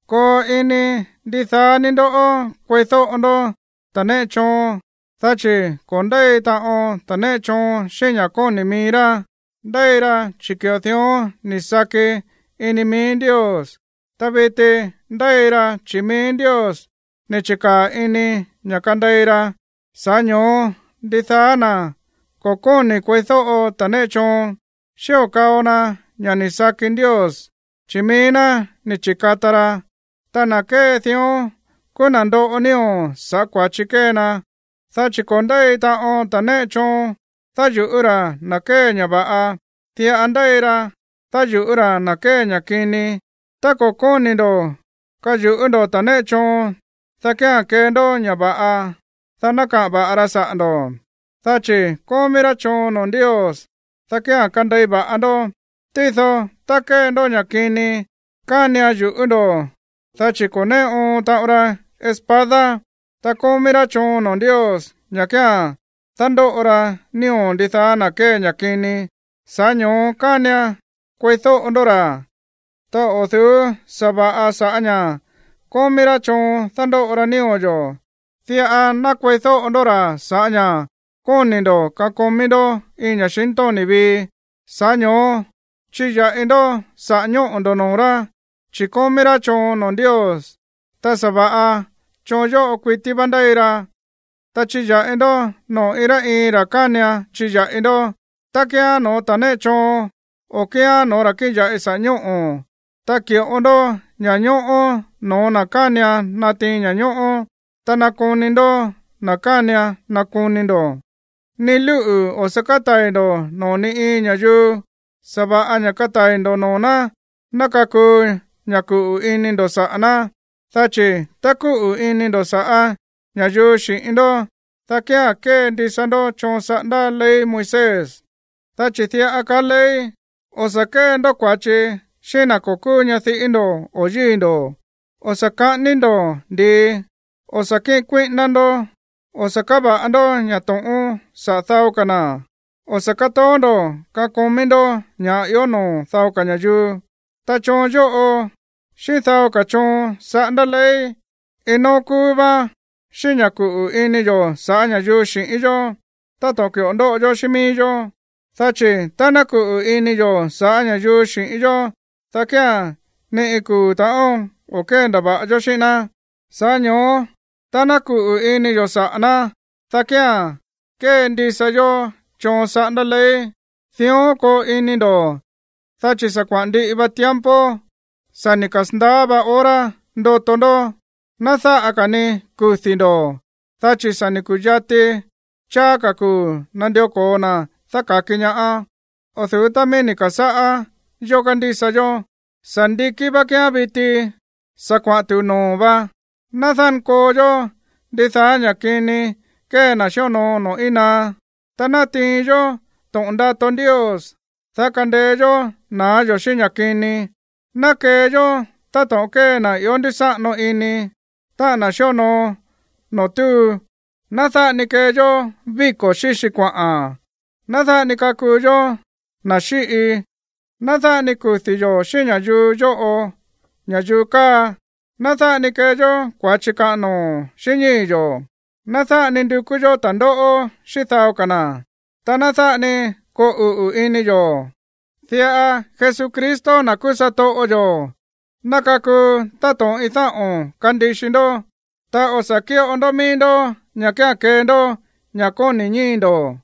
Koo ini ndidaá ní ndó kueídóꞌo ndó ta̱ néꞌe choon, dá chi̱ ko̱ ndéi taꞌon ta̱ néꞌe choon xíꞌín ña̱ kóni̱ mií rá, ndéi ra chi̱ ki̱ꞌo dión ni̱ saki ini mií Ndios. Ta viti ndéi ra chi̱ mií Ndios ni̱ chi̱kaa̱ ini ña̱ kandei ra. Sa̱ꞌá ño̱ó, ndidaá na̱ ko̱ kóni̱ kueídóꞌo ta̱ néꞌe choon, xío kao na ña̱ sakí mií Ndios, chi̱ mií ná ni̱ chi̱kata ra. Ta na̱ kée dión kúú na̱ ndoꞌo nío̱ sa̱ꞌá kua̱chi kée ná. Dá chi̱ ko̱ ndéi taꞌon ta̱ néꞌe choon dáyu̱ꞌú ra̱ na̱ kée ña̱ va̱ꞌa. Diꞌa ndéi ra dáyu̱ꞌú ra̱ na̱ kée ña̱ kini. Tá ko̱ kóni̱ ndo̱ kayu̱ꞌú ndo̱ ta̱ néꞌe choon, dá kía̱n kee ndó ña̱ va̱ꞌa, dá ná kaꞌa̱n va̱ꞌa ra saꞌa̱ ndo̱. Dá chi̱ kómí rá choon noo̱ Ndios, dá kía̱n kandei va̱ꞌa ndó. Tído tá kée ndó ña̱ kini, kánian yu̱ꞌú ndo̱, dá chi̱ ko̱ néꞌe oon taꞌon ra espada. Ta kómí rá choon noo̱ Ndios ña̱ kía̱n dándóꞌo ra nío̱ ndidaá na̱ kée ña̱ kini. Sa̱ꞌá ño̱ó kánian kueídóꞌo ndó ra̱, ta o̱ du̱ú sa̱va̱ꞌa sa̱ꞌá ña̱ kómí rá choon dándóꞌo ra nío̱ yo̱. Diꞌa ná kueídóꞌo ndó ra̱ sa̱ꞌá ña̱ kóni̱ ndo̱ kakomí ndó iin ña̱xintóni̱ vii. Sa̱ꞌá ño̱ó chiya̱ꞌi ndó saꞌa̱ ñóꞌo̱ ndo̱ noo̱ rá, chi̱ kómí rá choon noo̱ Ndios, ta sa̱va̱ꞌa choon yóꞌo kuití vá ndéi ra. Ta chiya̱ꞌi ndó noo̱ iin rá iin ra̱ kánian chiya̱ꞌi ndó, ta kíán no̱ó ta̱ néꞌe choon, o kíán no̱ó ra̱ kíꞌin ya̱ꞌi saꞌa̱ ñóꞌo̱. Ta ki̱ꞌo ndó ña̱ñóꞌó no̱ó na̱ kánian natiin ña̱ñóꞌó, ta nakoni ndo̱ na̱ kánian nakoni ndo̱. Ni lúꞌu̱ o̱ sa̱ kátai̱ ndo̱ noo̱ ni iin ña̱yuu, sa̱va̱ꞌa ña̱ katai̱ ndo̱ noo̱ ná ná kakuu ña̱ kuꞌu̱ ini ndo̱ saꞌa̱ ná. Dá chi̱ tá kúꞌu̱ ini ndo̱ sa̱ꞌá ña̱yuu xi̱ꞌín ndó, dá kía̱n kéndisa ndó choon saꞌándá ley Moisés. Dá chi̱ diꞌa kaá ley: “O̱ sa̱ kée ndó kua̱chi xíꞌín na̱ ko̱ kúú ñadiꞌí ndo̱ o yíi̱ ndo̱, o̱ sa̱ ka̱ꞌání ndo̱ ndi̱i, o̱ sa̱ kíꞌin kuíꞌíná ndó, o̱ sa̱ káva̱ꞌa ndó ña̱ to̱ꞌón saꞌa̱ dao ka̱ na̱, o̱ sa̱ kátoó ndo̱ kakomí ndó ña̱ꞌa ió noo̱ dao ka̱ ña̱yuu.” Ta choon yóꞌo xíꞌín dao ka̱ choon saꞌándá ley, iin nóó kúú váán xíꞌín ña̱ kúꞌu̱ ini yo̱ sa̱ꞌá ña̱yuu xi̱ꞌín yó táto̱ꞌon ki̱ꞌo ndóꞌo yó xíꞌín mií yó. Dá chi̱ tá ná kuꞌu̱ ini yo̱ saꞌa̱ ña̱yuu xi̱ꞌín yó, dá kía̱n ni iin kuu̱ ta̱ꞌón o̱ kéndava̱ꞌa yó xíꞌín ná. Sa̱ꞌá ño̱ó tá ná kuꞌu̱ ini yo̱ saꞌa̱ ná, dá kía̱n kéndisa yó choon saꞌándá ley. Dión koo ini ndo̱, dá chi̱ sa̱ kuaꞌa̱n ndiꞌi va tiempo. Sa̱ ni̱ kasa̱ndaá va hora ndoto ndó, ná dáꞌa ka̱ ni kudi̱ ndo̱, dá chi̱ sa̱ ku̱yati cháá ka̱ kuu̱ nandió ko̱o na̱ dáka̱ki ñaá o̱ du̱ú tá míí ni̱ ka̱sáꞌá yó kándísa yó na̱. Sa̱ ndikí vá kíán viti, sa̱ kuaꞌa̱n tu̱u noo̱ vá. Ná dánkoo yó ndidaá ña̱ kini kée na̱ xíonoo noo̱ íin naá. Ta ná tiin yó to̱ꞌon ndato Ndios, dá kandeé yó na̱á yo̱ xíꞌín ña̱ kini. Ná kee yó táto̱ꞌon kée na̱ ió ndúsáꞌano ini, táꞌa̱n na̱ xíonoo noo̱ túu. Ná dáꞌa ni kee yó víko̱ xíxi kuaꞌa̱n, ná dáꞌa ni kakuu yó na̱ xíꞌi, ná dáꞌa ni kudi̱ yo̱ xíꞌín ña̱yuu yóꞌo, ña̱yuu káa, ná dáꞌa ni kee yó kua̱chi kaꞌan noo̱ xíꞌín ñíi̱ yo̱, ná dáꞌa ni ndukú yó ta̱ndóꞌó xíꞌín dao ka̱ na̱, ta ná dáꞌa ni koo uꞌu̱ ini yo̱. Diꞌa Jesucristo, na̱ kúú satoꞌo yo̱, ná kakuu táto̱ꞌon iin dáꞌo̱n kandixi ndó, ta o̱ sa̱ kíꞌo ndó mií ndó ña̱ kía̱n kee ndó ña̱ kóni̱ ñíi̱ ndo̱.